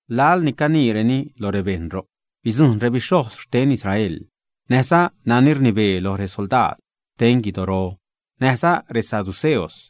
Laḻ ni caniireni lo rebejṉ, ro'c bidzujṉ rebixhojz xten Israel näjza nani rnibee lo resoldaad xten guidoro näjza resaduceos.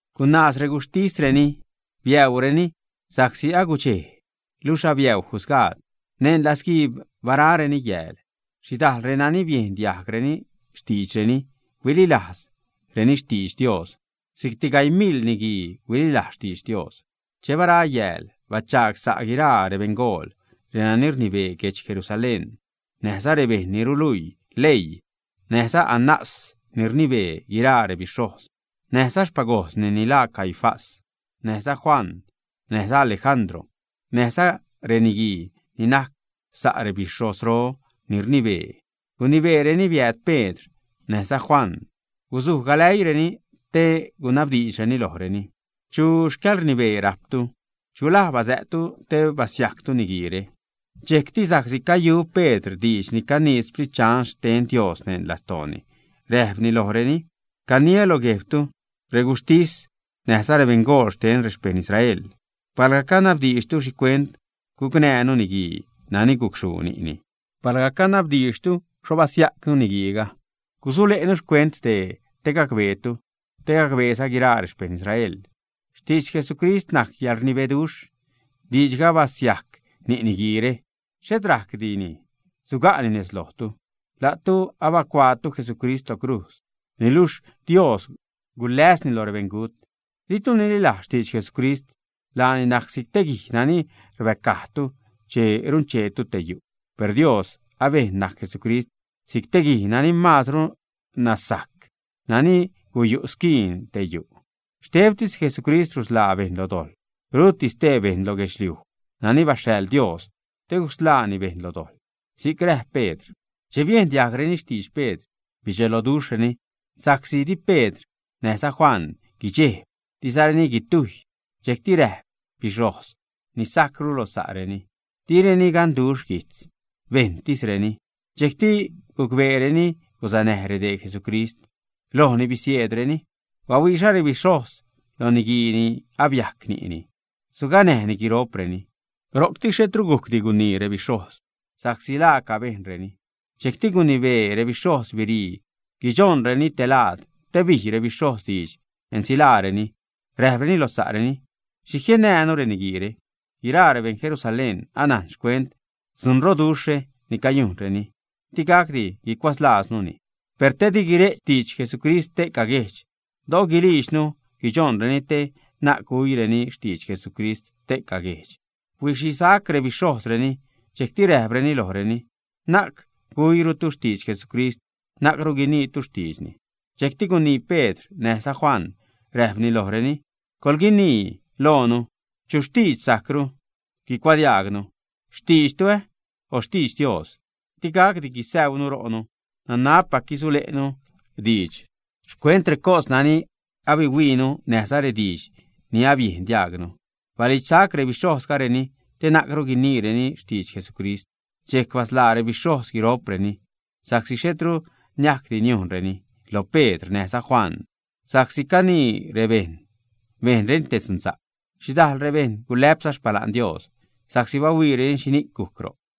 Gunaaz reguxhtisreni, biäureni sa'csi agudxej luxh abiäu jusgaad. Neṉ latzguiib barareni yääl. Xhidajḻ reni biejn diajg xtiidxreni huililajz xtidx Dios. Si'cti gaii mil niguii huililajz xtidx Dios. Che bara yääl, bachaag sa' guiraa rebeṉgool, renani rnibee guedx Jerusalén, näjza rebejṉ ni ruluii leii, näjza Anás ni rnibee guiraa rebixhojz, näjza xpagojzni ni laa Caifás, näjza Juan, näjza Alejandro, näjza guiraa reniguii ni najc sa' rebixhozro ni rnibee. Gunibeereni biääd Pedr näjza Juan gusuj galäiireni te gunabdiidxreni lojreni: ―¿Chu xcäḻrnibee rajptu? ¿Chu laj basä'ttu te basiajctu niguiire? Dxejcti sa'csi cayu Pedr diidx ni canii Sprit Dxan xten Dios neṉ lastooni, räjpni lojreni: ―Caniä lo guejbtu, reguxhtis näjza rebeṉgool xten rexpejṉ Israel, palga canabdiidxtu xhicuent gucnäjnu niguii nani gucxhuu ni'ni, palga canabdiidxtu xho basiajcnu niguiiga, gusule'nu xcuent dee te gacbeetu te gacbeeza guiraa rexpejṉ Israel. Xtidx Jesucrist najc yäḻrnibeduxh. Diidxga abasiajc ni' niguiire, xhet rajcdini suga'ni nez lojtu. La'tu abacuaatu Jesucrist lo crujz, niluxh Dios guläsni lo rebeṉgut. Di'tu ninälajz xtidx Jesucrist. Laani najc si'c te guij nani rbäcajtu che runcheetu te yu'. Per Dios abejn najc Jesucrist si'c guij nani maazru nacsa'c, nani guyu' squiin xte yu'. Xtebtis Jesucrist rusḻaa bejṉ lo dojḻ, ruti stee bejṉ lo guedxliuj nani baxhaḻ Dios te gusḻaani bejṉ lo dojḻ ―si'c räjp Pedr. Che biejn diajgreni xtidx Pedr, bidxelojreni sa'csi di Pedr näjza Juan guidxejb, dizareni guitujy. Dxejcti räjp rebixhojz ni sajcru lo sa'reni: ―Direni ganduxh guijtz, bejṉtisreni. Dxejcti gucbeereni gusanäj redee Jesucrist, lojni bisieedreni. Bahuiiza rebixhojz lo niguii ni abiajc ni'ni, suganäjni guiro'preni. Ro'cti xhetru gujcdi gunii rebixhojz sa'csi laaca bejnreni. Dxejcti gunibee rebixhojz birii guidxojnreni telaad te bij rebixhojz diidx ensilaareni. Räjpreni lo sa'reni: ―¿Xhi jiennäänu reniguiire? Guiraa rebeṉ Jerusalén anajn xcuent dzunroduxhre ni cayujnreni. Digacdi gucuatzlaaznuni. Per te di guire'ch xtidx Jesucrist ste'ca guejdx, do'o gulijdxnu guidxojnreni te na'c guiniirureni xtidx Jesucrist ste'ca guejdx. Huixisac rebixhojzreni. Dxejcti räjpreni lojreni: ―Na'c guluirutu xtidx Jesucrist, na'cru guiniitu xtiidxni. Dxejc gunii Pedr näjza Juan, räjpreni lojreni: ―¿Coḻguinii loonu chu xtiidx sajcru guicuadiaagnu? ¿Xtiidx la'tu, o xtiidx Dios? Digacdi gusäunu ro'nu. Nanabpac gusule'nu diidx xcuent recos nani abahuiinu näjza rediidx ni abiejn diajgnu. Balidxsac rebixhojzreni te na'cru guiniireni xtidx Jesucrist. Dxejc basḻaa rebixhojz guiro'preni, sa'csi xhetru niajcdi niujnreni lo Pedr näjza Juan, sa'csi canii rebejṉ bejnreni te dzunsa'c. Xhidajl rebejṉ gulä'pza xpala'n Dios sa'csi bahuiireni xhini'c gujc ro'c.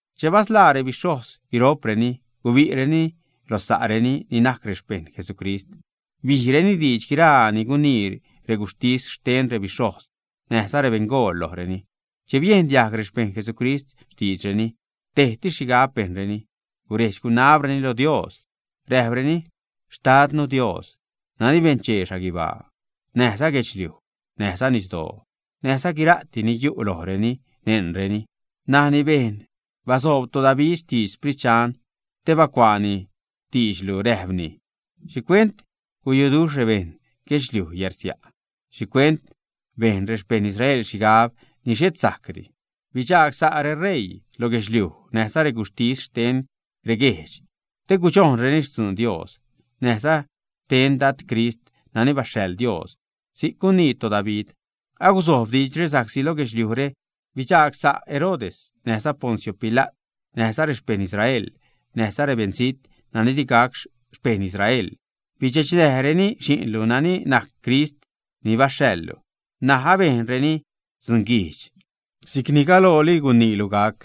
Che basḻaa rebixhojz guiro'preni, gubi'reni lo sa'reni ni najc rexpejṉ Jesucrist. Bijreni diidx guiraa ni gunii reguxhtis xten rebixhojz näjza rebeṉgool lojreni. Che biejn diajg rexpejṉ Jesucrist xtiidxreni, tejtis xhigab bejnreni guredx-gunabreni lo Dios, räjpreni: ―Xtadnu Dios, nani benchee xhaguibaa näjza guedxliuj näjza nisdoo näjza guira'ti ni yu' lojreni, neṉreni, nani bejn basoob toDavid xtidx Sprit Dxan te bacuaani xtiidxlu, räjpni: ¿Xhicuent guyuduxh rebeṉ guedxliuj yärsia'? ¿Xhicuent bejn rexpejṉ Israel xhigab ni xhet sajcdi? Bidxagsa' reṟeii lo guedxliuj näjza reguxhtis xten reguejdx te gudxojnreni xtzun Dios näjza xten Dad Crist nani baxhaḻ Dios, si'c gunii toDavid. ’Aguzojb diidxre, sa'csi lo guejdxre bidxagsa' Herodes näjza Poncio Pila't näjza rexpejṉ Israel näjza rebeṉzijt nani di gac xpejṉ Israel. Bidxechnäjreni Xi'nlu nani najc Crist ni baxhaḻlu. N̲aj abejnreni dzunguijdx si'cni galooli guniilu gac.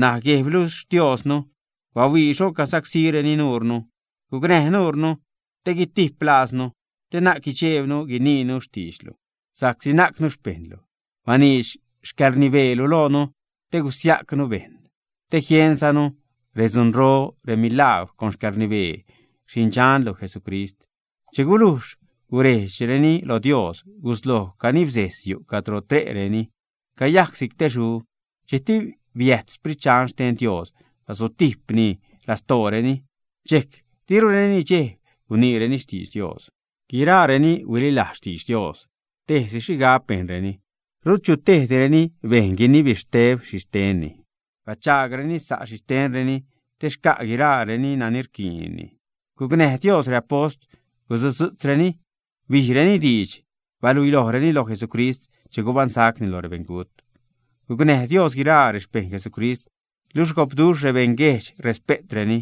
N̲aj Guejblu Xtiosnu, bahuii xho cagusacsíreni nuure, gucnäj nuure te gutiplaaznu, te na'c guidxeebnu guiniinu xtiidxlu, sa'csi najcnu rexpejṉlu. Baniidx xcäḻrnibeelu loonu te guisiajcnu rebejṉ, te jienzanu redzunro, remilajgwr con xcäḻrnibee Xi'ndxanlu Jesucrist. Che gulujx gurejdxreni lo Dios, gusloj canibsejz yu' cadro tre'reni, cayac si'c te xu. Dxejcti biääd Sprit Dxan xten Dios basutijpruni lastooreni. Dxejc dirureni nidxejb guniireni xtidx Dios. Guiraa renani huililajz xtidx Dios, tejsi xhigab bejnreni. Rut chu tejdireni bejn guinibexteb xhixtenni: bachaagreni sa' rexhixtenreni te xca' guiraareni nani rquiinreni. Gucnäj Dios reapost, gusutzu'tzreni bijreni diidx bahuilojreni loj Jesucrist che gubaṉsacni lo rebeṉgut. Gucnäj Dios guiraa rexpejṉ Jesucrist, luxh gopduxh rebeṉ guejdx respe'treni.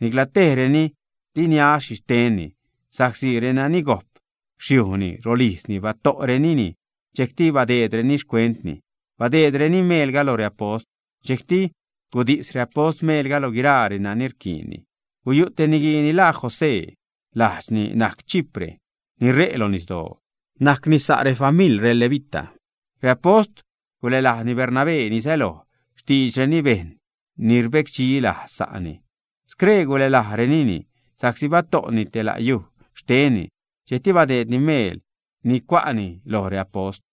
Ni'cla tejreni di niäädx xhixtenni sa'csi renani gojp xyujni, rolijzni, bato'renini, dxejcti biädnäreni xcuentni, badeedreni meelga lo reapost. Dxejcti gudis reapost meelga lo guiraa renani rquiinni. Guyu' te niguii ni laa José. Lajdxni najc Chipre, ni ṟe' lo nisdoo. Najcni sa' rexfamiḻ levita. Reapost gulälajni Bernabé (ni säloj xtiidxreni bejṉ ni rbecdxi lajz sa'ni). Scree gulälajrenini sa'csi bato'ni te la' yuj xtenni, dxejcti badeedni meel ni cua'ni lo reapost.